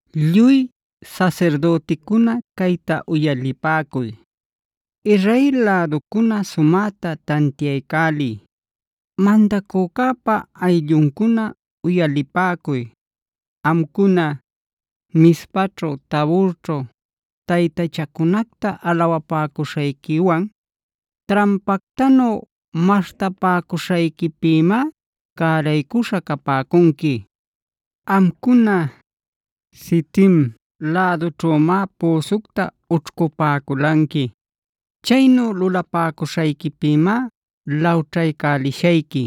“Lluy sasirdüticuna, cayta uyalipäcuy. Israel läducuna, sumäta tantiaycäliy. Mandacücäpa aylluncuna, uyalipäcuy. Amcuna, Mizpaćhu Taborćhu taytachacunacta alawapäcuśhayquiwan trampactanu maśhtapäcuśhayquipïmá cäraycuśha capäcunqui. Amcuna, Sitim lädućhümá püsucta ućhcupäculanqui. Chaynu lulapäcuśhayquipïmá lawćhaycälishayqui.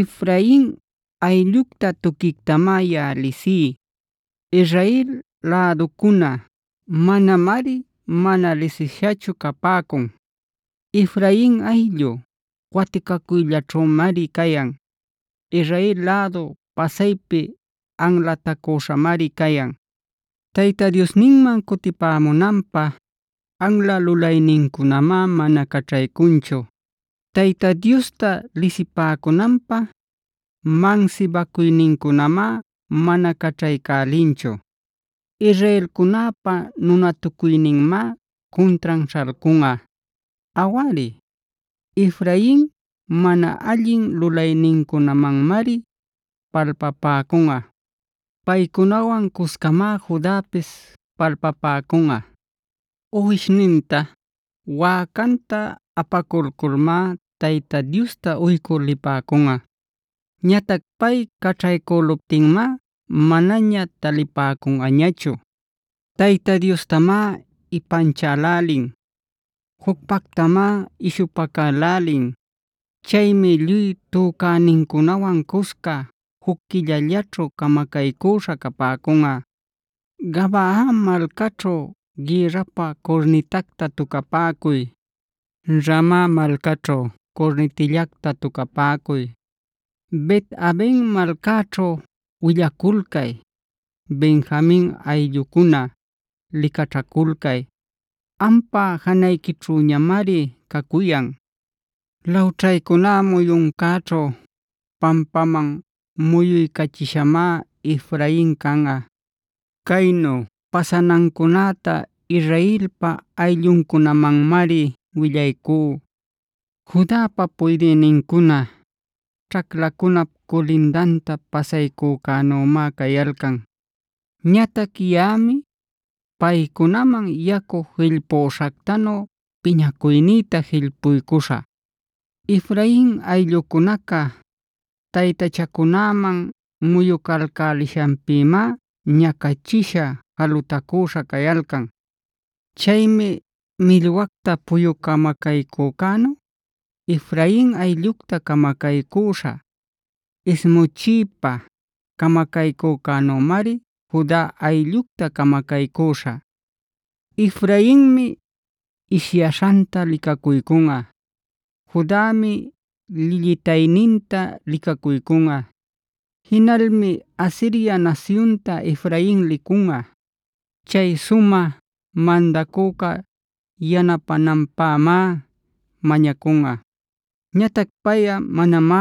Efrain ayllucta tuquictamá yaꞌa lisí. Israel läducuna manamari mana lisishachu capäcun. Efrain ayllu waticacuyllaćhümari cayan. Israel lädu pasaypi anlatacüśhamari cayan. “Tayta Diosninman cutipämunanpä anla lulaynincunamá mana caćhaycunchu. Tayta Diosta lisipäcunanpä mansibacuynincunamá mana caćhaycälinchu. “Israelcunäpa nunatucuyninmá cuntran śhalcunꞌa. Awari, Efrain mana allin lulaynincunamanmari palpapäcunꞌa. Paycunawan cuscamá Judapis palpapäcunꞌa. Uwishninta, wäcanta apaculculmá Tayta Diosta uycü lipäcunꞌa. Ñatac pay caćhaycüluptinmá manaña talipäcunꞌañachu. Tayta Diostamá ipanchälälin; jucpactamá ishupacälälin. Chaymi lluy tücänincunawan cusca juc quillallaćhu camacaycüśha capäcunꞌa. “Gabaa malcaćhu gïrrapä curnitacta tucapäcuy. Rama malcaćhu curnitillacta tucapäcuy. Bet-avena malcaćhu willaculcay. Benjamin ayllucuna, licaćhaculcay; ampa janayquićhüñamari cacuyan. Lawćhaycuná muyuncäćhu pampaman muyuycachishamá Efrain canꞌa. Caynu pasanancunäta Israelpa aylluncunamanmari willaycú. “Judapa puydïnincuna ćhaclacunap culindanta pasaycücänümá cayalcan.b Ñatac yaꞌami paycunaman yacu jillpüśhactanu piñacuynïta jillpuycüśhä. Efrain ayllucunaca taytachacunäman muyucalcälishanpïmá ñacachisha jalutacüśha cayalcan. Chaymi millwacta puyu camacaycücänu Efrain ayllucta camacaycüśhä; ismuchiypa camacaycücänümari Juda ayllucta camacaycüśhä. “Efrainmi ishyaśhanta licacuycunꞌa. Judami llillïtayninta licacuycunꞌa. Jinalmi Asiria nasyunta Efrain licunꞌa.c Chay sumä mandacüca yanapänanpämá mañacunꞌa. Ñatac payꞌa manamá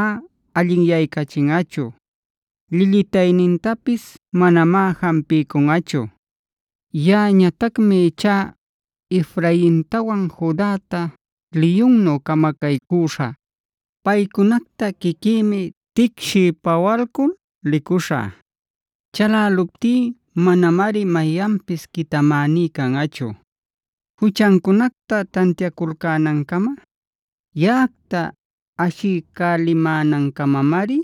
allinyaycachinꞌachu; llillïtaynintapis manamá jampiycunꞌachu. Yaꞌañatacmi ichá Efraintawan Judäta liyunnu camacaycüśhä. Paycunacta quiquïmi ticshiy-pawalcul licuśhä. Chaläluptí manamari mayanpis quitamäní canꞌachu. Juchancunacta tantiaculcänancama yaꞌacta ashiycälimänancamamari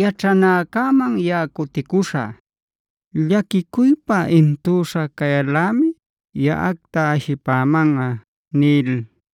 yaćhanäcäman yaꞌa cuticuśhä. Llaquicuypa intüśha cayal-lämi yaꞌacta ashipämanꞌa” nil.